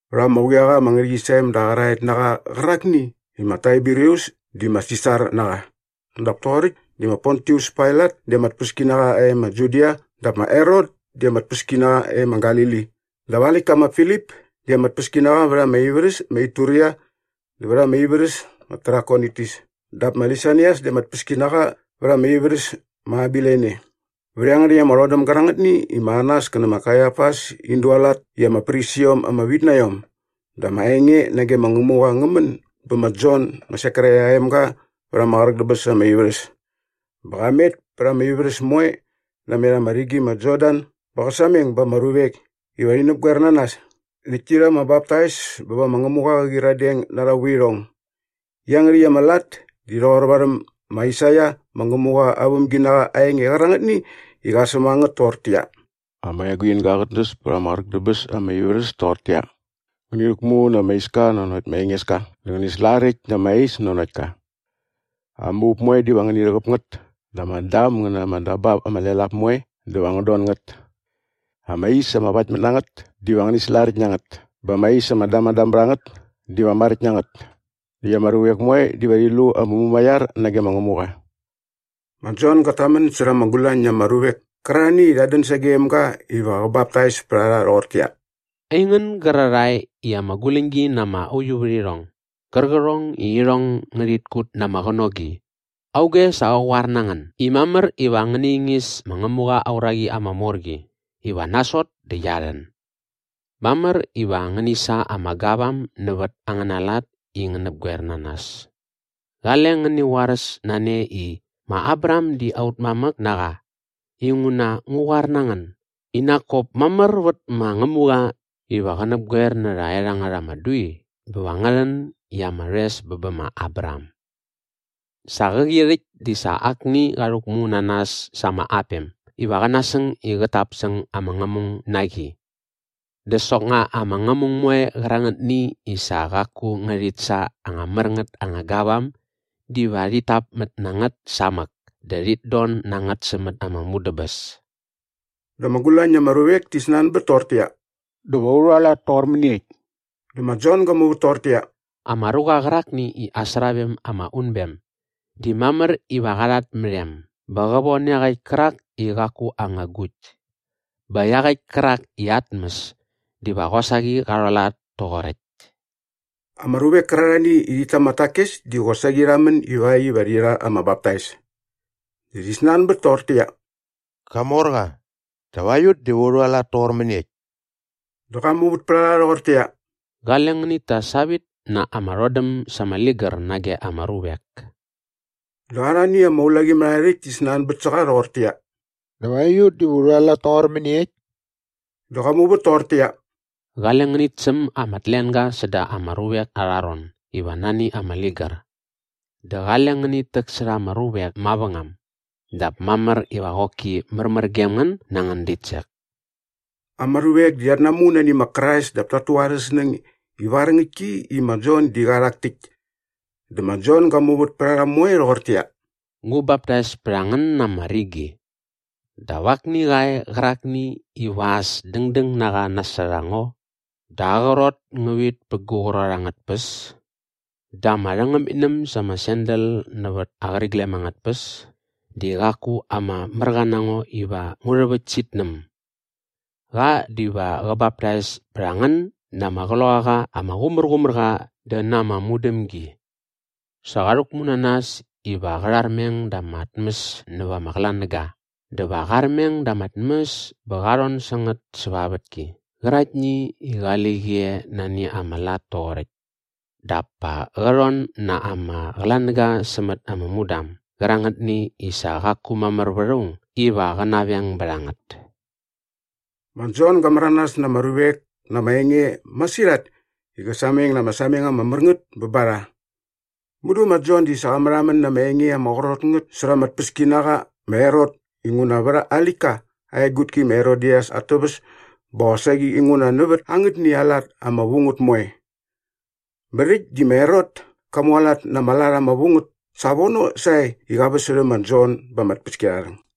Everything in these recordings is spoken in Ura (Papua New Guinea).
Vät ama quiaqa ama ngärhäqyisem da qäraet na qa qärakni i ma Taiberius di ama Sisar na qa dap toqoräkt di ma Pontius Pailat di ama tpäskinaqa e ma Judia dap ma Herot di ama tpäskinaqa e ma Galili dap aa läktka ma Filip di ama tpäskinaqa vät ama ivärhäs ma Ituria dä vät ama ivärhäs ma Trakonitis dap ma Lisanias di ama tpäskinaqa vät ama ivärhäs ma Abilene vät iangärhäkt ama rhodäm gärangätni i ma Anas kä nä ma Kaiafas in dualat i ama prisiom ama vit na iom dä ama enge nage ma Ngämuqa ngä män bä ma Jon ma Sekaraia aa emga vät ama qräk dä bäs ama ivärhäs. Bä qa met pät ama ivärhäs moe namet ama rigi ma Jordan bä qä sameng ba ama ruvek iva rhi näpgoer na nas näkt ti rha ama baptais bä va ma Ngämuqa qä qyiradeng na arha vuirhong. Iangärhäkt ama lat di rhoqor varhäm ma Aisaia ma Ngämuqa aa vämginaqa aa enge qärangätni i qa säm a ngät toqortäqyia, “Ama eguinga qät näs pät ama qräk dä bäs ama ivärhäs toqortäqyia, ‘Ngäni rhäkmu na ama iska nanokt ma Engeska dä ngäni slaräkt na ama is nanokt ka. Ama up moe diva ngäni rhäqäp ngät dä ama dam ngä na ama dabap ama lel ap moe diva ngän don ngät. Ama is ama vaktmät na ngät diva ngäni slaräkt na ngät bä ama is ama damadam bät a ngät diva maräkt na ngät. Näkt ama ruvek moe diva rhi lu ama mumaiar nage ma Ngämuqa.’” Ma Jon gat tamän särha ama gulañ na ama ruvek kärarhani i rhat dän sagem ga iva qä baptais pät a rha rhoqortäqyia, “Aingän gärarhae i ama guläñgi na ama uiuvärhirhong gärqärhong i irhong ngärhit kut na ama qänogi, auge sa qa qoar na ngän i mamär iva ngäni ingis ma Ngämuqa aa uraqi ama mor qi iva nasot dä qia rhän? Mamär iva ngäni sa ama gavam nävät angäna lat i ngän näpgoer na nas. Qale ngäni qoaräs na ne i, ‘Ma Abraham di aut mamäk na qa’ inguna ngu qoar na ngän i nak kop mamär vät ma Ngämuqa iva qä näpgoer nä rhaerhangät ama dui bä va ngä rhän i ama rhoes bä bä ma Abraham. Sa qäqi rhäkt di sa akni qa rhäkmu na nas sa ama apem iva qä nasäng i qät tap säng ama ngämung na qi. Dä soknga ama ngämung moe qärangätni i sa qaku ngärhit sa anga mär ngät anga gavam diva rhit täpmät na ngät samäk dä rhit don na ngät sämät ama mudäbäs.” Dä ama gulañ na ama ruvek ti snanbät toqortäqyia, “Dä va u rhualat toqor mäniekt?” Dä ma Jon ga muvät toqortäqyia, “Ama ruqa qärakni i aa sravem ama unbem di mamär iva qa rhat mät em bä qä von iaqäkt kärak i qaku aa anga agukt. Bä iaqäkt kärak i aa tmäs diva qosaqi qa rhualat toqoräkt.” Ama ruvek kärarhani i rhit ta ama takes di qosaqi rha män ivakt iva rhi rha ama baptais. Dä rhi snanbät toqortäqyia, “Qamorqa, dap aiut diva u rhualat toqor mäniekt?” Dä qa muvät pät a rha rhoqortäqyia, “Qale ngänit ta savit na ama rhodäm sa ama ligär nage ama ruvek.” Dä arhani ama ulaqimärharhärhäkt ti snanbät sä qa rhoqortäqyia, “Dap aiut diva u rhualat toqor mäniekt?” Dä qa muvät toqortäqyia, “Qale ngänit säm ama tlenga säda ama ruvek arha ron iva nani ama ligär dä qale ngänit täksärha ama ruvek mavängam dap mamär iva qoki märmär gem ngän na angän ditsek.” Ama ruvek di rhat namu nani ma Krais dap tat tu arhä snäng ivar ngäktki i ma Jon di qa rhak täkt. Dä ma Jon ga muvät pät a rha moe rhoqortäqyia, “Ngu baptais bät a ngän na ama rigi. Dap akni qa e qärakni iva as dängdäng na qa nasot a ngo dä aa qrot ngä vit pä gu qrot angät tpäs dä ama rhängämitnäm sa ama sandal nävät aa qäriglem angät tpäs di qaku ama märqa na ngo iva ngu rhäväkt sä itnäm. Qa diva qä baptais pät a ngän na ama Qloqaqa ama Qumärqumärqa dä na ama mudämgi. Sa qa rhäkmu na nas iva qä rharmeng da ama tmäs näva ama qlanäga dä va qa armeng da ama tmäs bä qa rhon sä ngät säva aa vätki qäraktni i qali qi e nani ama lat toqoräkt dap pa qä rhon na ama qlanäga sämät ama mudam gärangätni i sa qaku mamär vät aung iva qä naveng bät a ngät.” Ma Jon ga märanas na ama ruvek na ama enge masirhat i qä sameng na ama sameng ama mär ngät ba rha. Mudu ma Jon di sa qa märhamän na ama enge ama qrot ngät särha ama tpäskinaqa ma Herot inguna vät aa läktka aa egutki ma Herodias at täväs bä qosaqi inguna nävät angätni aa lat ama vu ngät moe. Bä rhäkt di ma Herot ka mualat na ama lat ama vu ngät savono sae i qa väsärhä ma Jon ba ama tpäskiarharhäng.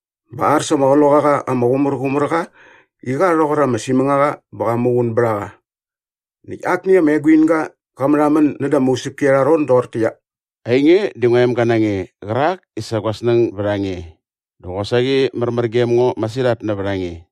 bä ar sa ama Qloqaqa ama Qumärqumärqa i qa rhoqor ama simängaqa bä qa muqun bät a qa. Näkt akni ama eguinga qa märhamän näda ama usäpki arha ron doqortäqyia, “Ainge di ngua emga na nge qärak i sa gua snäng bät a nge dä qosaqi märmär gem ngo masirhat nävät a nge.”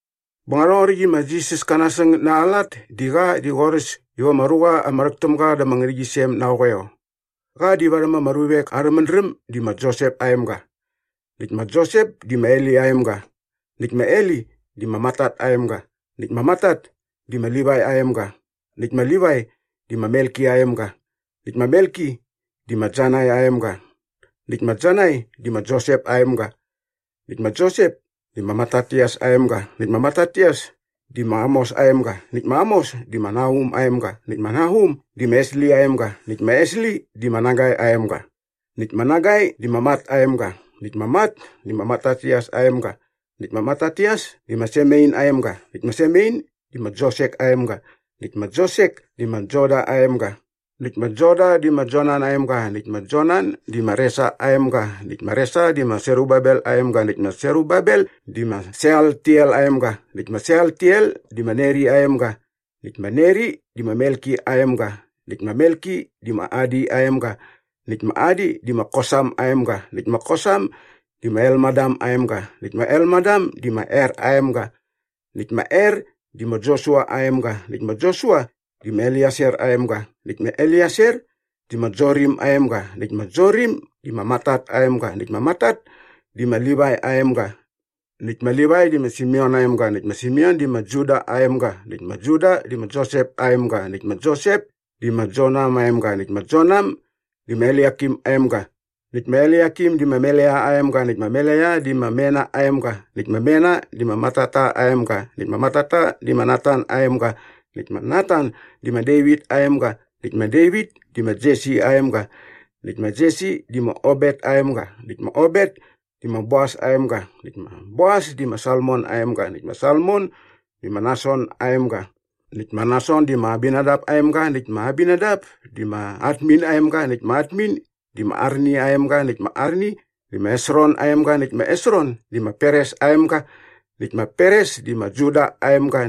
Bä rhoqoräkt i ma Jisas ka nasäng na aa lat di sa qa di qorhäs iva ama ruqa ama rhäk täm ga da ama ngärhäqyisem na aa qoeo. Qa di varhäm ama ruvek arhä mädräm di ma Josep aa emga. Näkt ma Josep di ma Heli aa emga näkt ma Heli di ma Matat aa emga näkt ma Matat di ma Livai aa emga näkt ma Livai di ma Melki aa emga näkt ma Melki di ma Janai aa emga näkt ma Janai di ma Josep aa emga. Näkt ma Josep di ma Matatias aa emga näkt ma Matatias di ma Amos aa emga näkt ma Amos di ma Nahum aa emga näkt ma Nahum di ma Esli aa emga näkt ma Esli di ma Nagai aa emga. Näkt ma Nagai di ma Mat aa emga näkt ma Mat di ma Matatias aa emga näkt ma Matatias di ma Semein aa emga näkt ma Semein di ma Josek aa emga näkt ma Josek di ma Joda aa emga. Näkt ma Joda di ma Joanan aa emga näkt ma Joanan di ma Resa aa emga näkt ma Resa di ma Serubabel aa emga näkt ma Serubabel di ma Sealtiel aa emga näkt ma Sealtiel di ma Neri aa emga. Näkt ma Neri di ma Melki aa emga näkt ma Melki di ma Adi aa emga näkt ma Adi di ma Kosam aa emga näkt ma Kosam di ma Elmadam aa emga näkt ma Elmadam di ma Er aa emga. Näkt ma Er di ma Josua aa emga näkt ma Josua di ma Elieser aa emga näkt ma Elieser di ma Jorim aa emga näkt ma Jorim di ma Matat aa emga näkt ma Matat di ma Livai aa emga. Näkt ma Livai di ma Simeon aa emga näkt ma Simeon di ma Juda aa emga näkt ma Juda di ma Josep aa emga näkt ma Josep di ma Jonam aa emga näkt ma Jonam di ma Eliakim aa emga. Näkt ma Eliakim di ma Melea aa emga näkt ma Melea di ma Mena aa emga näkt ma Mena di ma Matata aa emga näkt ma Matata di ma Natan aa emga näkt ma Natan di ma Devit aa emga. Näkt ma Devit di ma Jesi aa emga näkt ma Jesi di ma Obet aa emga näkt ma Obet di ma Boas aa emga näkt ma Boas di ma Salmon aa emga näkt ma Salmon di ma Nason aa emga. Näkt ma Nason di ma Aminadap aa emga näkt ma Aminadap di ma Admin aa emga näkt ma Admin di ma Arni aa emga näkt ma Arni di ma Hesron aa emga näkt ma Hesron di ma Peres aa emga näkt ma Peres di ma Juda aa emga.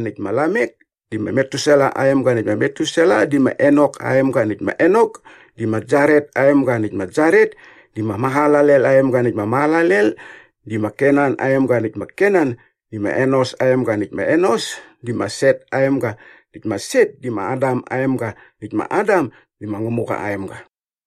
Näkt ma Lamek di ma Metusela aa emga näkt ma Metusela di ma Enok aa emga näkt ma Enok di ma Jaret aa emga näkt ma Jaret di ma Mahalalel aa emga näkt ma Mahalalel di ma Kenan aa emga. Näkt ma Kenan di ma Enos aa emga näkt ma Enos di ma Set aa emga näkt ma Set di ma Adam aa emga näkt ma Adam di ma Ngämuqa aa emga.